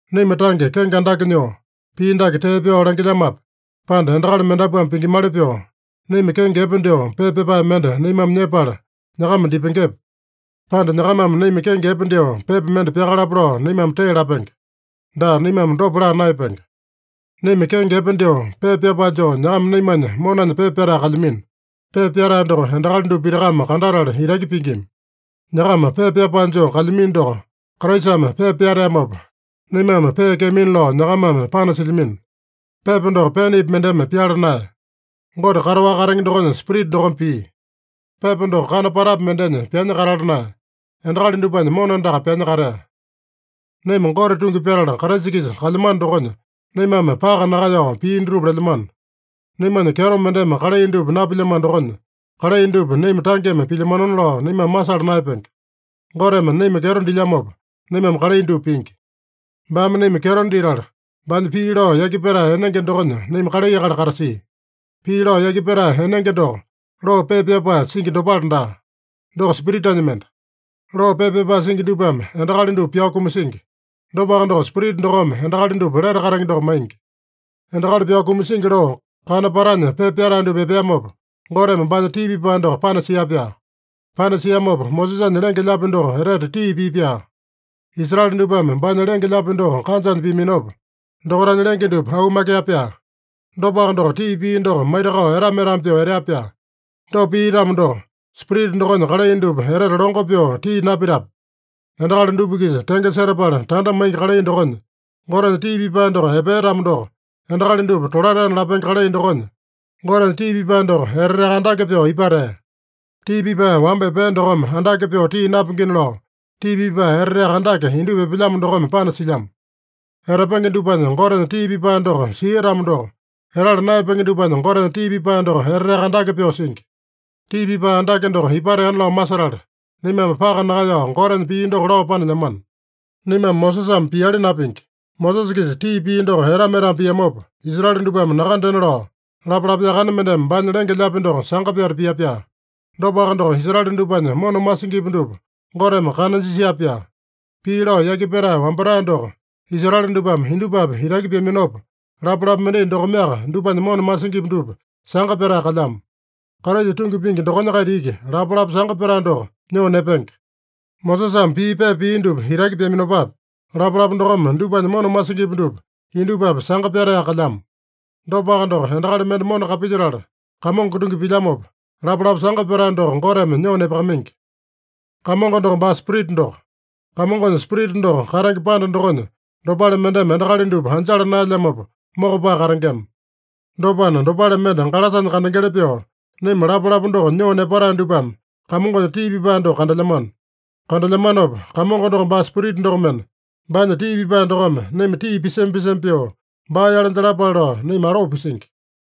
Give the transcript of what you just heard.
Naima tange kenge andake nyoo, pii dake tee pyao langilyamape, pande endakali mendapuame pingimali pyoo, naima kenge epe dyoo pepa pyapae mende naimame nyepala nyakama dipengepe? Pande nyakamame naima kenge epe dyoo pepa mende pyakalapa lao, naimame tee lapenge? Daa, naimame dopa laa naeyapenge. Naima kenge epe dyoo pepa pyapae joo nyakama naimanya monanya pepa pyatae kalyamino. Pepa pyatae doko endakali dupa pitakame kandatala itaki pingima. Nyakama pepa pyapae joo kalyamino doko Kraisame pepa pyateamopa, naimame peekeamina lao nyakamame panasilyamino. Pepa doko penepi mendeme pyala naeya. Gote kataowaka katenge dokonya Spirita dokome pia. Pepa doko kana patapi mendenya pyanya katala naeya. Endakali dupanya mona andaka pyanya katea. Naima Gote tungi pyatala Kraisa-kisa kalyamano dokonya, naimame paka nakaeyao pii dutupa lelyamano. Naimanya kyeto mendeme kalai dupa napilyamano dokonya, kalai dupa naima tangeme pilyamanona lao naimame masala naeyapenge. Goteme naima kyeto dilyamopa, naimame kalai dupa pingi. Baame naima kyeto ditala, baanya pii lao yaki petae enenge dokonya naima kalai akali katasia. Pii lao yaki petae enenge doko, loo pepa pyapae singi dopale daa. Doko Spiritanya mende. Loo pepa pyapae singi dupame endakali dupa pyao kumasingi. Dopaka doko, Spirita dokome endakali dupa lete katenge doko maingi. Endakali pyao kumasingi loo, kana patanya pepa pyatae dupa epeamopa, Goteme baanya tii pipae doko panasia-pyaa. Panasiamopa, Mosesanya lenge-lyaapi doko etete tii pia-pyaa. Israele dupame baanya lenge-lyaapi doko kanjanya piaminopa, dokaitanya lenge dupa aumakea-pyaa. Dopaka doko, tii pia doko maitakao etama-etama pyoo etea-pyaa. Dopa pia-tamo doko, Spirita dokonya kalai dupa etete longo pyoo tii napitape? Endakali dupa-kisa tenge setapala tanda maingi kalai dokonya Gotenya tii pipae doko epea-tamo doko, endakali dupa tolataena lapenge kalai dokonya Gotenya tii pipae doko eteteaka andake pyoo ipatea. Tii pipae wamba epea dokome andake pyoo tii napingina lao, tii pipae eteteaka andake indupa epelyamo dokome panasilyamo. Etapenge dupanya Gotenya tii pipae doko sia-tamo doko, etala naeyapenge dupanya Gotenya tii pipae doko eteteaka andake pyoo singi. Tii pipae andake doko ipateana lao masetala, naimame paka nakaeyao Gotenya pii doko lao panelyamano. Naimame Mosesame piali napingi. Mosesa-kisa tii pia doko etama-etama piamopa, Israele dupame nakandena lao, lapalapa yakane mendeme baanya lenge-lyaapi doko sanga pyata pia-pyaa. Dopaka doko, Israele dupanya mona masingipi dupa Goteme kana jisia-pyaa. Pii lao yaki petae wambatae doko Israele dupame indupapi itaki pyaminopa, lapalapa mendai dokomeaka dupanya mona masingipi dupa sanga pyatae kalyamo. Kraisa tungi pingi dokonya-kaita iki lapalapa sanga pyatae doko nyoo nepenge. Mosesame pii pepa pia dupa itaki pyaminopapi, lapalapa dokome dupanya mona masingipi dupa indupapi sanga pyataeyaka kalyamo. Dopaka doko, endakali mende mona kapilyetala, Kamongo tungi pilyamopa, lapalapa sanga pyatae doko Goteme nyoo nepakamaingi. Kamongo doko baa Spirita doko. Kamongonya Spirita doko katenge panda dokonya dopale mendeme endakali dupa anjala naelyamopa mokopae katengema. Dopana, dopale mende galasanya kandengeli pyoo, naima lapalapa doko nyoo nepatae dupame Kamongonya tii pipae doko kandelyamano. Kandelyamanopa, Kamongo doko baa Spirita dokomena, baanya tii pipae dokome naima tii pisema-pisema pyoo baa-yale jalapale lao naima aloo pisingi.